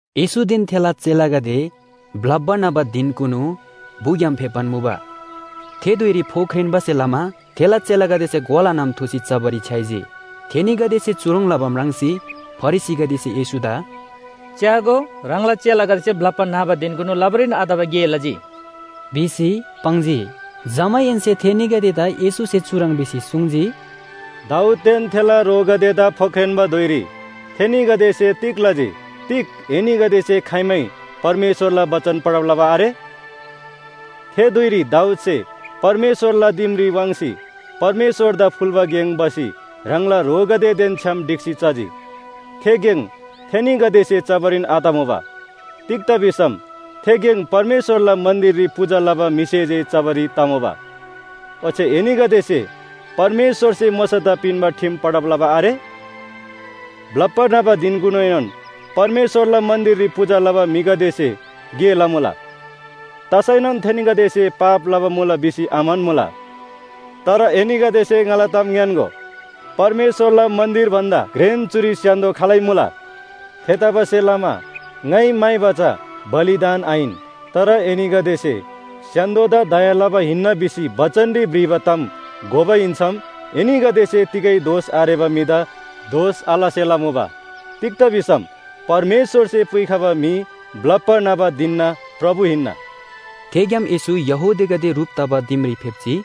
येशूदेन थेला चेलागदे ब्‍लप्‍बा न्‍हबा धिनकुनु बु‍ग्‍याम फेप्‍बान मुबा। थे धुइरी फोख्रेन्‍बासे लमा थेला चेलागदेसे ग्‍वाला नम थुसी चबारी छ्‌याइजी। थेनीगदेसे चुह्रङ् लबा म्राङ्सी फरिसीगदेसे येशूदा “च्‍यागो, ह्राङला चेलागदेसे ब्‍लप्‍बा न्‍हबा धिनकुनु लबारीन आतबा गे लजी” भिसी पाङ्जी। जमाहेन्‍से थेनीगदेदा येशूसे चुह्रङ् भिसी सुङ्जी, “दाऊददेन थेला ह्रोगदेदा फोख्रेन्‍बा धुइरी थेनीगदेसे तिग लजी? तिग एनीगदेसे खाइमै परमेश्‍वरला बचन पढब लबा आरे? थे धुइरी दाऊदसे परमेश्‍वरला दिमरी वाङ्सी परमेश्‍वरदा फुल्‍बा गेङ भसी ह्राङला ह्रोगदेदेन छ्‌याम ढिक्‍सी चजी। थे गेङ थेनीगदेसे चबारीन आतमुबा। तिग्‍दा भिसम थे गेङ परमेश्‍वरला मन्‍दिररी पूजा लबा म्‍हिसे जे चबारी तमुबा। ओच्‍छे एनीगदेसे परमेश्‍वरसे मोशादा पिन्‍बा ठिम पढब लबा आरे? ब्‍लप्‍बा न्‍हबा धिनकुनुएनोन परमेश्‍वरला मन्‍दिररी पूजा लबा म्‍हिगदेसे गे लमुला, तसैनोन थेनीगदेसे पाप लबा मुला भिसी आम्‍हन्‍मुला। तर एनीगदेसे ङाला ताम ङ्‌यान्‍गो, परमेश्‍वरला मन्‍दिर भन्‍दा घ्रेन चुरी स्‍य्‍हान्‍दो खालै मुला। थेतबासेलमा ‘ङाइ म्‍हाइबा चा बलिदान आहिन, तर एनीगदेसे स्‍य्‍हान्‍दोदा लबा दया हिन्‍ना’ भिसी बचनरी भ्रिबा ताम घोबा हिन्‍सम एनीगदेसे तिगै दोष आरेबा म्‍हिदा दोष आलसेला मुबा। तिग्‍दा भिसम परमेश्‍वरसे पुइखबा म्‍हि ब्‍लप्‍बा न्‍हबा धिनना प्रभु हिन्‍ना।” थेग्‍याम येशू यहूदीगदे ह्रुप तबा दिमरी फेप्‍जी।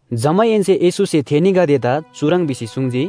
जमाहेन्‍से येशूसे थेनीगदेदा चुह्रङ् भिसी सुङ्जी,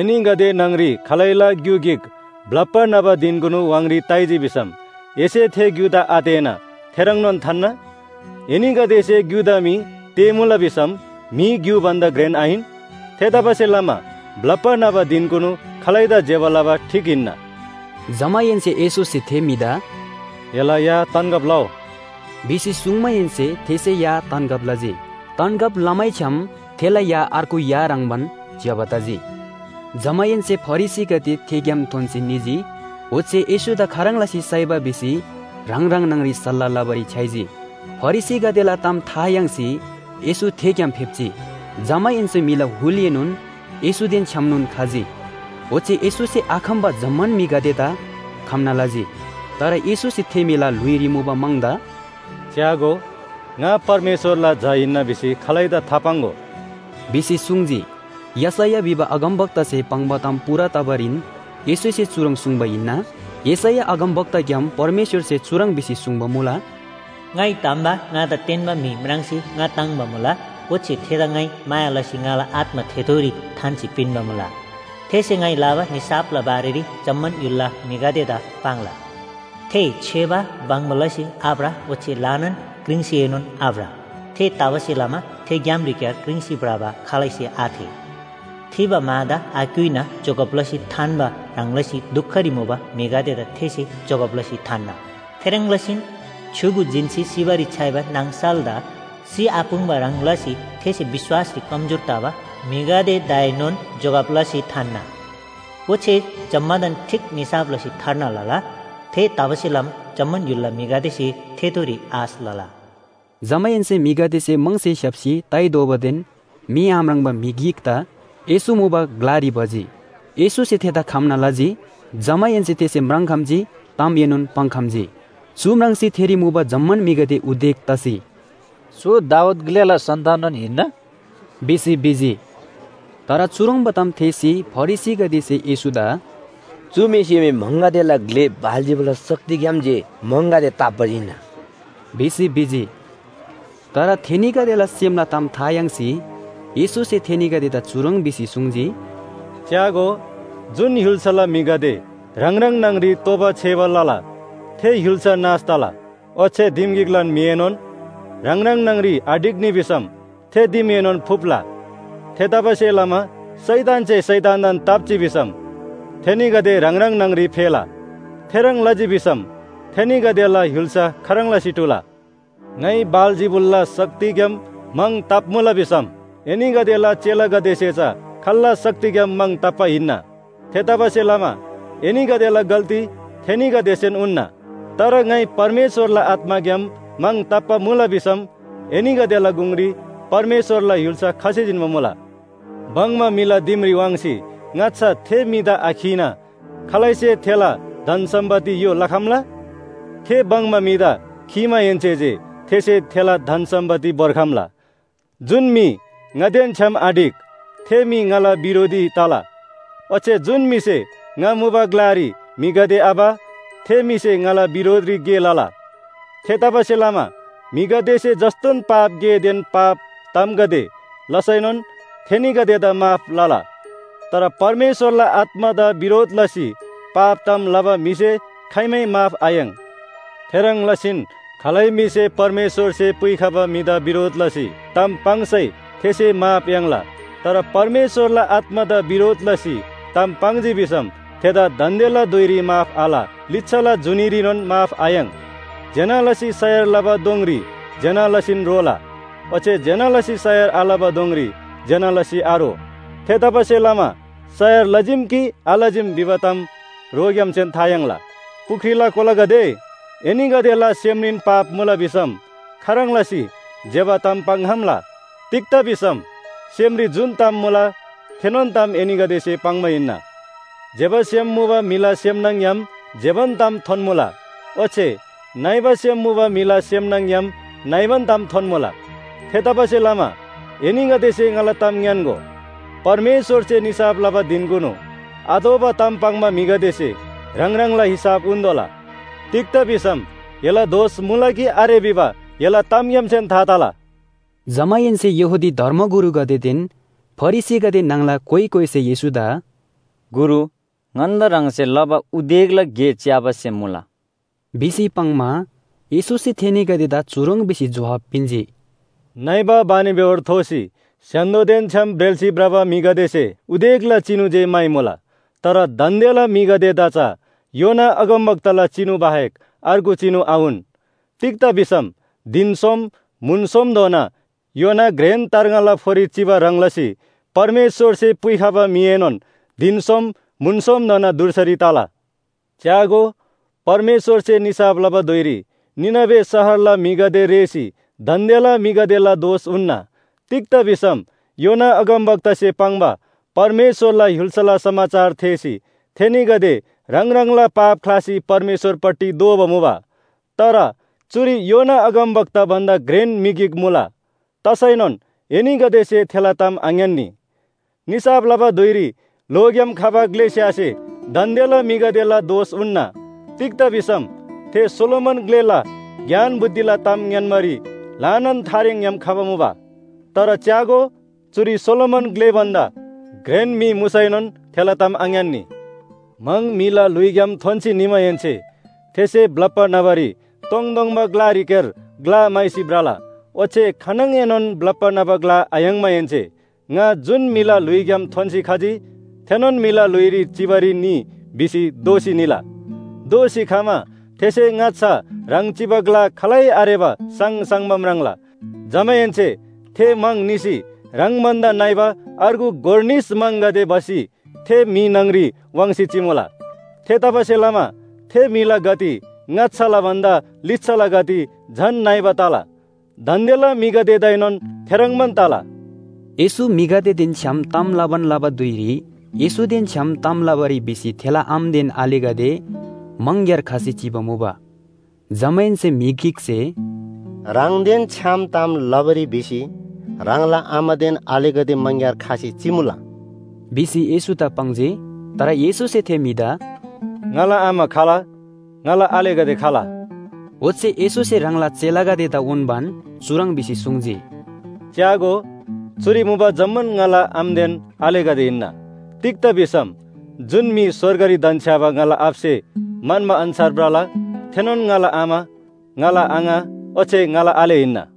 “एनीगदे न्‍हङ‍री खालैला ग्‍यु गिक ब्‍लप्‍बा न्‍हबा धिनकुनु व्‍हाङरी ताइजी भिसम एसे थे ग्‍युदा आतेःना थेह्रङ्नोन थान्‍ना? एनीगदेसे ग्‍युदा मी तेःमुला भिसम म्‍हि ग्‍यु भन्‍दा घ्रेन आहिन? थेतबासेलमा ब्‍लप्‍बा न्‍हबा धिनकुनु खालैदा ज्‍यबा लबा ठीक हिन्‍ना।” जमाहेन्‍से येशूसे थे म्‍हिदा “एला या तन्‍गब लउ” भिसी सुङ्माहेन्‍से थेसे या तन्‍गब लजी। तन्‍गब लमैछ्‌याम थेला या अर्गु या ह्रङ्‌बान ज्‍यबा तजी। जमाहेन्‍से फरिसीगदे थेग्‍याम थोन्‍सी निजी, ओच्‍छे येशूदा खाह्रङ् लसी साइबा भिसी ह्राङ ह्राङ न्‍हङरी सल्‍लाह लबारी छ्‌याइजी। फरिसीगदेला ताम था याङ्सी येशू थेग्‍याम फेप्‍जी। जमाहेन्‍से म्‍हिला हुलएनोन येशूदेन छ्‌यामनोन खजी, ओच्‍छे येशूसे आखम्‍बा जम्‍मान म्‍हिगदेदा खम्‍ना लजी। तर येशूसे थे म्‍हिला ल्‍हुइरी मुबा म्‍हङदा “च्‍यागो, ङा परमेश्‍वरला झा हिन्‍ना भिसी खालैदा थापाङ्‍गो” भिसी सुङ्जी। यशैया भिबा अगमवक्तासे पाङ्बा ताम पूरा तबारीन येशूसे चुह्रङ् सुङ्बा हिन्‍ना। यशैया अगमवक्ताग्‍याम परमेश्‍वरसे चुह्रङ् भिसी सुङ्बा मुला, “ङाइ धम्‍बा ङादा तेन्‍बा म्‍हि म्राङ्सी ङा ताङ्‍बा मुला। ओच्‍छे थेदा ङाइ माया लसी ङाला आत्‍मा थेथोरी थान्‍सी पिन्‍बा मुला, थेसे ङाइ लबा निसाफला बारेरी जम्‍मान य्‍हुलला म्‍हिगदेदा पाङ्ला। थे छेबा बङ्बा लसी आभ्र ओच्‍छे ल्‍हानान क्रिङ्सीएनोन आभ्र। थेतबासेलमा थे ग्‍यामरीक्‍यार क्रिङ्सी भ्रबा खालैसे आथेः। थिबा मादा आक्‍युइना जोगब लसी थान्‍बा ह्रङ् लसी दुखरी मुबा म्‍हिगदेदा थेसे जोगब लसी थान्‍ना। थेह्रङ् लसीन छ्‌युगु जिन्‍सी सिबारी छ्‌याइबा नाङसलदा सिआपुङ्बा ह्रङ् लसी थेसे विश्‍वासरी कमजोर तबा म्‍हिगदेदाएनोन जोगब लसी थान्‍ना। ओच्‍छे जम्‍मादान ठीक निसाफ लसी थार्ना लला। थेतबासेलमा जम्‍मान य्‍हुलला म्‍हिगदेसे थेथोरी आश लला।” जमाहेन्‍से म्‍हिगदेसे म्‍हङसे स्‍याप्‍सी ताइ दोबादेन मी आम्राङ्बा म्‍हि गिकदा येशू मुबा ग्‍लारी भजी। येशूसे थेदा खम्‍ना लजी, जमाहेन्‍से थेसे म्राङ्‌खम्‍जी तामएनोन पाङ्‍खम्‍जी। चु म्राङ्सी थेरी मुबा जम्‍मान म्‍हिगदे उदेक तसी “चु दाऊद ग्‍लेला सन्‍ताननोन हिन्‍ना?” भिसी भिजी। तर चुह्रङ्बा ताम थेःसी फरिसीगदेसे येशूदा “चु म्‍हिसे मी म्‍हङगदेला ग्‍ले बालजिबुलला शक्तिग्‍याम जे म्‍हङगदे ताप्‍बा हिन्‍ना” भिसी भिजी। तर थेनीगदेला सेमला ताम था याङ्सी येशूसे थेनीगदेदा चुह्रङ् भिसी सुङ्जी, “च्‍यागो, जुन य्‍हुल्‍साला म्‍हिगदे ह्राङ ह्राङ न्‍हङ‍री तोबा छेबा लला थे य्‍हुल्‍सा नाश तला, ओच्‍छे दिम गिकलान म्‍हिएनोन ह्राङ ह्राङ न्‍हङ‍री आढिक्‍नी भिसम थे दिमएनोन फुप्‍ला। थेतबासेलमा शैतानसे शैतानदान ताप्‍जी भिसम थेनीगदे ह्राङ ह्राङ न्‍हङ‍री फेला। थेह्रङ् लजी भिसम थेनीगदेला य्‍हुल्‍सा खाह्रङ् लसी टुला? ङाइ बालजिबुलला शक्तिग्‍याम म्‍हङ ताप्‍मुला भिसम एनीगदेला चेलागदेसे चा खाल्‍ला शक्तिग्‍याम म्‍हङ ताप्‍बा हिन्‍ना? थेतबासेलमा एनीगदेला गल्‍ती थेनीगदेसेन उन्‍ना। तर ङाइ परमेश्‍वरला आत्‍माग्‍याम म्‍हङ ताप्‍बा मुला भिसम एनीगदेला गुङरी परमेश्‍वरला य्‍हुल्‍सा खसी जिन्‍बा मुला। “भङ्‍बा म्‍हिला दिमरी वाङ्सी ङाच्‍छा थे म्‍हिदा आखीना खालैसे थेला धन सम्‍पत्ति य्‍हो लखम्‍ला? थे भङ्‍बा म्‍हिदा खीमाहेन्‍से जे थेसे थेला धन सम्‍पत्ति भोर्खम्‍ला। “जुन म्‍हि ङादेन छ्‌याम आढिक, थे म्‍हि ङाला बिरोधी तला। ओच्‍छे जुन म्‍हिसे ङा मुबा ग्‍लारी म्‍हिगदे आभ, थे म्‍हिसे ङाला बिरोधरी गे लला। थेतबासेलमा म्‍हिगदेसे जस्‍तोन पाप गेदेन पाप तामगदे लसैनोन थेनीगदेदा माफ लला। तर परमेश्‍वरला आत्‍मादा बिरोध लसी पाप ताम लबा म्‍हिसे खाइमै माफ आयाङ्। थेह्रङ् लसीन खालै म्‍हिसे परमेश्‍वरसे पुइखबा म्‍हिदा बिरोध लसी ताम पाङ्सै थेसे माफ याङ्ला। तर परमेश्‍वरला आत्‍मादा बिरोध लसी ताम पाङ्जी भिसम थेदा दान्‍देला धुइरी माफ आल, लिच्‍छाला जुनीरीनोन माफ आयाङ्। “ज्‍यना लसी सयार लबा दोङरी ज्‍यना लसीन रोला। ओच्‍छे ज्‍यना लसी सयार आलबा दोङरी ज्‍यना लसी आरो। थेतबासेलमा सयार लजीम कि आलजीम भिबा ताम रोग्‍यामसेन था तला। पुख्रीला कोलागदे, एनीगदेला सेमरीन पाप मुला भिसम खाह्रङ् लसी ज्‍यबा ताम पाङ्‌खम्‍ला? तिग्‍दा भिसम सेमरी जुन ताम मुला, थेनोन ताम एनीगदेसे पाङ्बा हिन्‍ना। ज्‍यबा सेम मुबा म्‍हिला सेम न्‍हङ‍ग्‍याम ज्‍यबान ताम थोन्‍मुला ओच्‍छे नइबा सेम मुबा म्‍हिला सेम न्‍हङ‍ग्‍याम नइबान ताम थोन्‍मुला। थेतबासेलमा एनीगदेसे ङाला ताम ङ्‌यान्‍गो, परमेश्‍वरसे निसाफ लबा धिनकुनु आतोःबा ताम पाङ्बा म्‍हिगदेसे ह्राङ ह्राङला हिसाब उन्‍तोःला। तिग्‍दा भिसम एला दोष मुला कि आरे भिबा एला तामग्‍यामसेन था तला।” जमाहेन्‍से यहूदी धर्मगुरुगदेदेन फरिसीगदे न्‍हङला कोइ कोइसे येशूदा “गुरु, ङन्‍दा ह्राङसे लबा उदेकला गे च्‍याबा सेम मुला” भिसी पाङ्‌मा, येशूसे थेनीगदेदा चुह्रङ् भिसी जोहाब पिन्‍जी, “नइबा बानिबेहोर थोसी स्‍य्‍हान्‍दोदेन छ्‌याम ब्रेल्‍सी भ्रबा म्‍हिगदेसे उदेकला चिनु जे म्‍हाइमुला। तर दान्‍देला म्‍हिगदेदा चा योना अगमवक्ताला चिनु बाहेक अर्गु चिनु आउन। तिग्‍दा भिसम धिन सोम म्‍हुन सोमधोना योना घ्रेन तार्ङाला फोरी चिबा ह्रङ् लसी परमेश्‍वरसे पुइखबा म्‍हिएनोन धिन सोम म्‍हुन सोमधोना धुर्सारी तला। च्‍यागो, परमेश्‍वरसे निसाफ लबा धुइरी निनवे शहरला म्‍हिगदे रेःसी दान्‍देला म्‍हिगदेला दोष उन्‍ना। तिग्‍दा भिसम योना अगमवक्तासे पाङ्बा परमेश्‍वरला य्‍हुल्‍सा समाचार थेःसी, थेनीगदे ह्राङ ह्राङला पाप ख्‍लासी परमेश्‍वरपट्टि दोःबा मुबा। तर चुरी योना अगमवक्ता भन्‍दा घ्रेन म्‍हि गिक मुला। तसैनोन एनीगदेसे थेला ताम आङ्‌यान्‍नी। निसाफ लबा धुइरी ल्‍होग्‍याम खबा ग्‍लेस्‍यासे दान्‍देला म्‍हिगदेला दोष उन्‍ना, तिग्‍दा भिसम थे सोलोमन ग्‍लेला ज्ञान बुद्धिला ताम ङ्‌यान्‍बारी ल्‍हानान थारेङग्‍याम खबा मुबा। तर च्‍यागो, चुरी सोलोमन ग्‍ले भन्‍दा घ्रेन म्‍हि मुसैनोन थेला ताम आङ्‌यान्‍नी। “म्‍हङ म्‍हिला ल्‍हुइग्‍याम थोन्‍सी निमाहेन्‍से थेसे ब्‍लप्‍बा न्‍हबारी तोङतोङबा ग्‍लारीक्‍यार ग्‍ला म्‍हाइसी भ्रला। ओच्‍छे खानङएनोन ब्‍लप्‍बा न्‍हबा ग्‍ला आयाङ्माहेन्‍से, ‘ङा जुन म्‍हिला ल्‍हुइग्‍याम थोन्‍सी खजी थेनोन म्‍हिला ल्‍हुइरी चिबारी निइ’ भिसी दोःसी निला। दोःसी खमा थेसे ङाच्‍छा ह्राङ चिबा ग्‍ला खालै आरेबा साङसाङबा म्राङ्ला। जमाहेन्‍से थे म्‍हङ निसी ह्राङ भन्‍दा नइबा अर्गु गोर निस म्‍हङगदे भसी थे म्‍हि न्‍हङरी वाङ्सी चिमुला। थेतबासेलमा थे म्‍हिला गति ङाच्‍छाला भन्‍दा लिच्‍छाला गति झन नइबा तला। दान्‍देला म्‍हिगदेदाएनोन थेह्रङ्बान तला।” येशू म्‍हिगदेदेन छ्‌याम ताम लबान लबा धुइरी येशूदेन छ्‌याम ताम लबारी भिसी थेला आमादेन आलेगदे मङग्‍यार खसी चिबा मुबा। जमाहेन्‍से म्‍हि गिकसे “ह्राङदेन छ्‌याम ताम लबारी भिसी ह्राङला आमादेन आलेगदे मङग्‍यार खसी चिमुला” भिसी येशूदा पाङ्जी। तर येशूसे थे म्‍हिदा “ङाला आमा खाल? ङाला आलेगदे खाल?” ओच्‍छे येशूसे ह्राङला चेलागदेदा उन्‍बान चुह्रङ् भिसी सुङ्जी, “च्‍यागो, चुरी मुबा जम्‍मान ङाला आमादेन आलेगदे हिन्‍ना। तिग्‍दा भिसम जुन म्‍हि स्‍वर्गरी धन्‍छ्‌याबा ङाला आबासे म्‍हन्‍बा अन्‍छार भ्रला थेनोन ङाला आमा, ङाला आङा ओच्‍छे ङाला आले हिन्‍ना।”